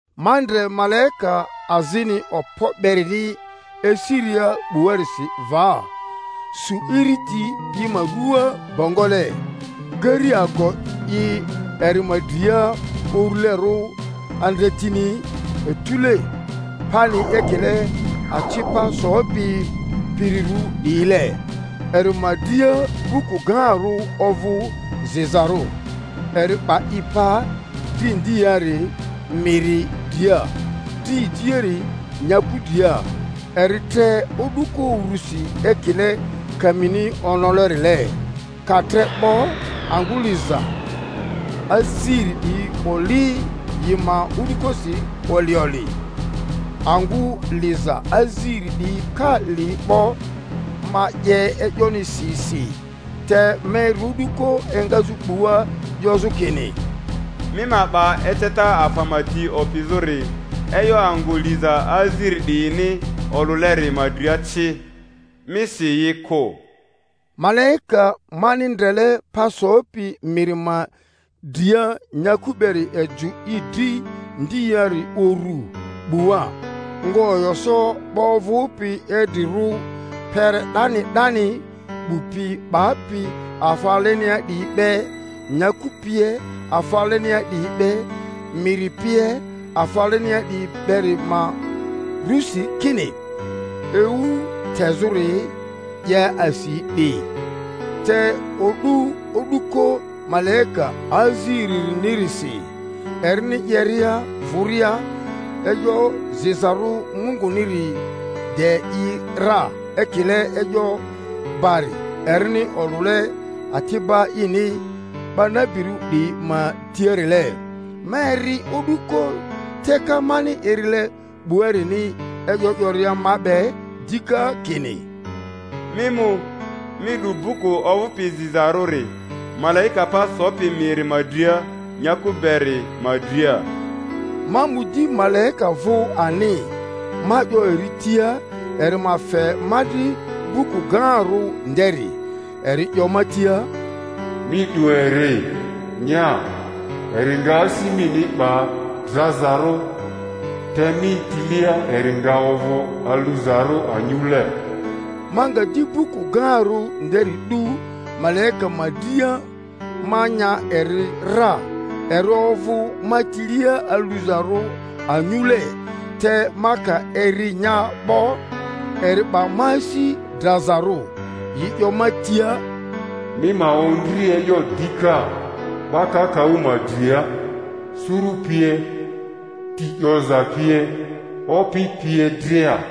Ma ndre malaika azini okpo berini esiria 'buarisi va, su iriti i ma ruaa bongole, gari ago i eri ma dria urulerᴜ, andretini etule, pani ekile aci pa sopi pirirᴜ 'diyile. Eri ma dria buku gaarᴜ ovᴜ zizarᴜ. Eri 'ba i pa dri ndiari miri dria, dri ejiari nyaku dria, eri tre o'duko urusi ekile kamini onolerile; ka tre 'bo, angᴜ liza aziri 'diyi oli yi ma o'dukosi oli oli. Angᴜ liza aziri 'diyi ka li 'bo, ma 'ye e'yoni si si, te ma eri o'duko engazᴜ 'bua 'yozᴜ kini, Mi ma 'ba eceta afa ma ti opizᴜri e'yo angᴜ liza aziri 'diyini olᴜleri ma dria ci, mi si yi kᴜ. Malaika mani ndrele pa sopi miri ma dria nyaku beri ejᴜ i dri ndiari urᴜ 'bua, nga oyo so 'ba ovᴜpi idrirᴜ kpere 'dani 'dani, 'bu pi 'bapi afa alenia 'diyi be, nyaku pie afa alenia 'diyi be, miri pie afa alenia 'diyi beri ma rᴜsi, kini ewu tezᴜri 'ye asi 'di, te o'du o'duko malaika aziririnirisi, erini 'yeria vᴜria, e'yo zizarᴜ Munguniri de i ra ekile e'yo bari erini olᴜle ati'ba ini 'ba nabirᴜ 'diyi ma tiarile. Ma eri o'duko teka mani erile 'buarini e'yo 'yoria ma be dika kini, Mi mu, mi 'du buku ovᴜpi zizarᴜri malaika pa sopi miri ma dria nyaku beri ma dria. Ma mu di malaika vᴜ ani, ma 'yo eri tia eri ma fe ma dri buku gaarᴜ nderi. Eri 'yo ma tia, Mi 'du eri, nya; eri nga asi mini 'ba drazarᴜ, te mi tilia eri nga ovᴜ aluzarᴜ anyule. Ma nga di buku gaarᴜ nderi 'du malaika ma dria, ma nya eri ra; eri ovᴜ ma tilia aluzarᴜ anyule, te ma ka eri nya 'bo, eri 'ba ma asi drazarᴜ. Yi 'yo ma tia, Mi ma ondri e'yo dika 'ba kakaᴜ ma dria, suru pie, ti 'yoza pie, opi pie dria.